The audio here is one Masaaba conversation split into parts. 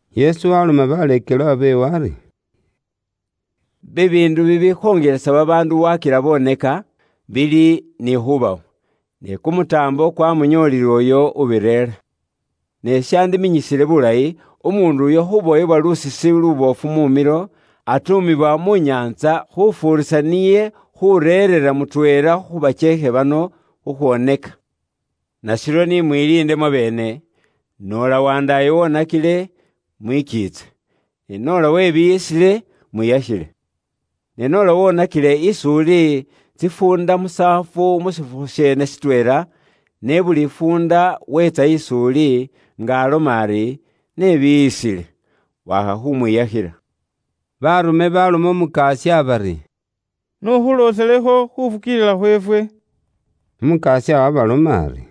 Yesu waloma baleekelwa beewe ari, “Bibiindu bibikhongelesa babaandu wakila boneka, bili ni khubawo, ne kumutaambo kwamunyoolile uyo ubireera. Ne shandiminyisile bulayi, umuundu uyo khubowebwa lusisi luboofu mu milo, atuumibwa mu nyaantsa, khufuurisa niye khureerera mutweela khu bakyeekhe bano khukhwoneka. Nashiryo ni mwiliinde mwabeene, noola wandaayo wonakile, mwikiitse, ne noola webiiyisile, mwiyakhile. Ne noola wonakile is'uli tsifuunda musaafu mu shifukhu sheene shitweela, ne buli fuunda weetsa is'uli, nga aloma ari, ‘Nebiiyisile,’ wakha khumwiyakhila.” Baarume baloma Umukasya bari, “Iwe n'ukhulooselekho ifwe khufukiilila khweefwe.” Umukasya waabaloma ari,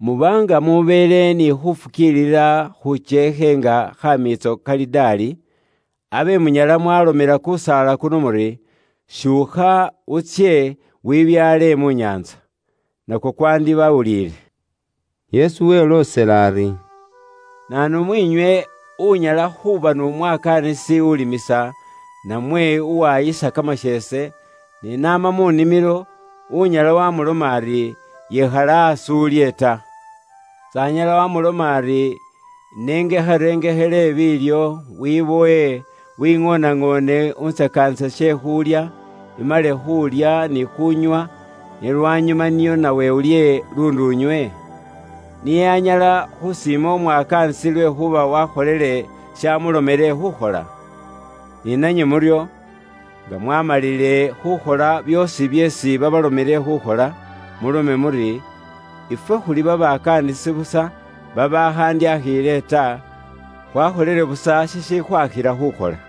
“Muba nga mubeele ni khufukiilila khukyeekhe nga khamiitso kaladaali, abe munyala mwaalomela kusaala kuno muri, ‘Syuukha, utsye, wibyaale mu nyaantsa.’ Nakwo kwandibawulile.” Yesu weloosela ari, “Naanu mwiinywe unyala khuuba n'umwakaanisi ulimisa, namwe uwaayisa kamasheese; ne n'ama mu nimilo, unyala wamuloma ari, ‘Yikhala aasi ulye ta?’ S'anyala wamuloma ari, ‘Inengekharengekhele biilyo, wibowe, wiŋooneŋoone untsakaanise she khulya, imale khuulya ni khuunywa, ne lwanyuma nio nawe ulye luundi unywe?’ Niye anyala khusiima umwakaanisi lwekhuuba wakholele shamulomele khukhola? Ni nanywe muryo, nga mwaamalile khukhola byoosi byeesi babalomile khukhola, mulome muri, ‘Ifwe khuli babakaanisi busa babaakhandyakhiile ta, khwakholile busa shishikhwakhila khukhola.’”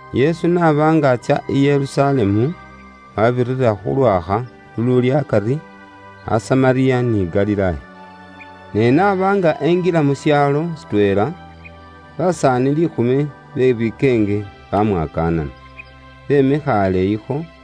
Yesu n'aba nga atsya i Yerusalemu, wabirira khu lwakha luluuli akari a Samariya ni Galilaaya. Ne n'aba nga enjila mu shaalo shitweela, basaani liikhumi be bikeenge bamwakaanana, bemikha aleeyikho,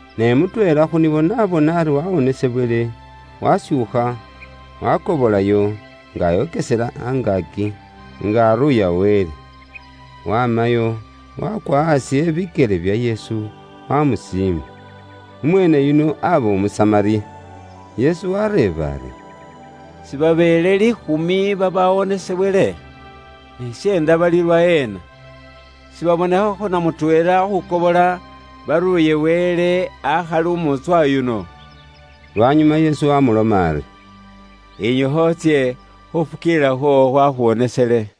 Ne mutweela khu nibo n'abona ari wawonesebwele, washuukha, wakobolayo, nga ayokesela angaaki, nga aruuya Wele. Wamayo, wakwa aasi ebikyele bya Yesu, wamusiima. Umweene yuno aba Umusamariya. Yesu wareeba ari, “Sibabeele liikhumi babawonesebwele? Ne syeenda bali lwaheena? Sibabonekhakho na mutweela khukobola, baruuye Wele, akhali umuutswa yuno?” Lwanyuma Yesu wamuloma ari, “Yinyukha utsye, khufukiilila khwoowo khwakhuwonesele.”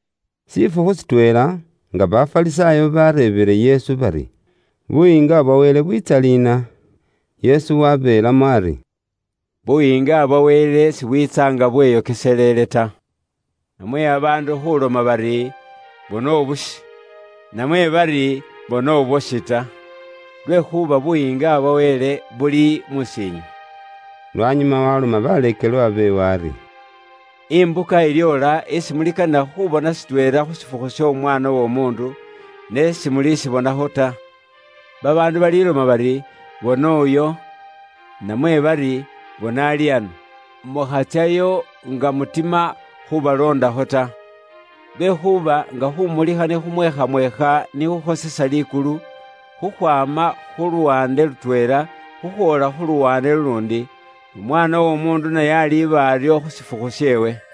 Shifukhu shitweela, nga Bafarisaayo bareebile Yesu bari Buyiinga bwa Wele bwiitsa liina, Yesu wabeelamo ari, “Buyiinga bwa Wele sibwiitsa nga bweyokeselele ta. Namwe babaandu khuloma bari, ‘Bona ubushi,’ namwe bari, ‘Bona ubwoshi’ ta. Lwekhuuba Buyiinga bwa Wele buli mus'iinywe.” Lwanyuma waloma baleekelwa beewe ari, “Imbuka ilyoola isi mulikanila khubona shitweela khu shifukhu sh'Omwaana w'Omuundu, ne simulishibonakho ta. Babaandu baliloma bari, ‘Bona uyo,’ namwe bari, ‘Bona ali ano.’ Mukhatsyayo nga mutima khubaloondakho ta. Lwekhuuba nga khumulikha ni khumweekhamweekha ni khukhosesa likulu, khukhwaama khu luwaande lutweela khukhwoola khu luwaande luluundi, n'Umwaana w'Omuundu naye aliba aryo khu shifukhu sheewe.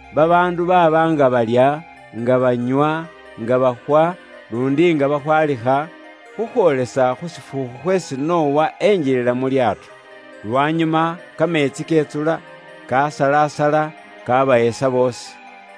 Babaandu baaba nga balya, nga banywa, nga bakhwa, luundi nga bakhwalikha, khukhwoolesa khu shifukhu khweesi Nowa enjilila mu likhoŋolo. Lwanyuma kameetsi ketsula, kasalasala, kabahesa boosi.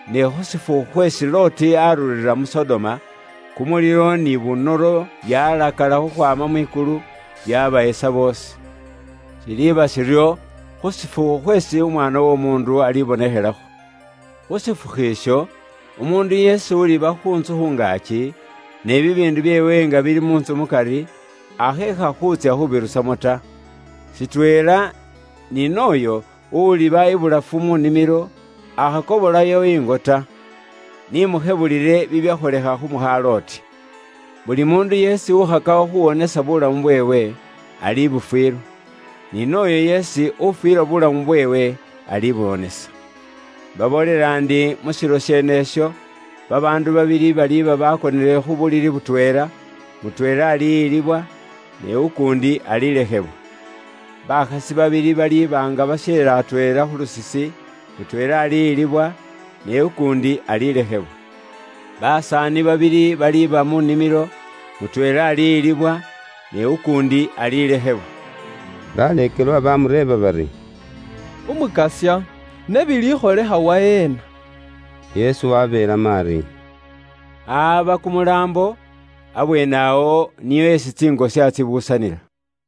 Ne khu shifukhu khweesi Loti arurira mu Sodoma, kumulilo ni bunoro byalakala khukhwaama mwikulu, byabahesa boosi. “Shiliiba shiryo khu shifukhu khweesi Umwaana w'Omuundu alibonekhelakho. Khu shifukhu isho, umuundu yeesi uliba khu ntsu khu ngaaki, ne bibiindu byeewe nga bili mu ntsu mukari, akheekha khuutsya khubirusamo ta. Shitweela ni nooyo uliba ibulafu mu nimilo, akhakobolayo ingo ta. Ni mukhebulile bibyakholekha khu mukha Loti. Buli muundu yeesi ukhakakho khuwonesa buulamu bweewe, alibufwilwa. Ni nooyo yeesi ufwilwa buulamu bweewe, alibuwonesa. Imbaboolela ndi mu shilo sheenesho, babaandu babili baliba bakonele khu bulili butweela, mutweela aliyilibwa, ne ukuundi alilekhebwa. Bakhasi babili baliba nga basyeera atweela khu lusisi, mutweela aliyilibwa, ne ukuundi alilekhebwa. Basaani babili baliba mu nimilo, mutweela aliyilibwa, ne ukuundi alilekhebwa.” Baleekelwa bamureeba bari, “Umukasya, ne bilikholekha waheena?” Yesu wabeelamo ari, “Ahaba kumulaambo, abweenewo, nio esi tsingosya tsibuusanila.”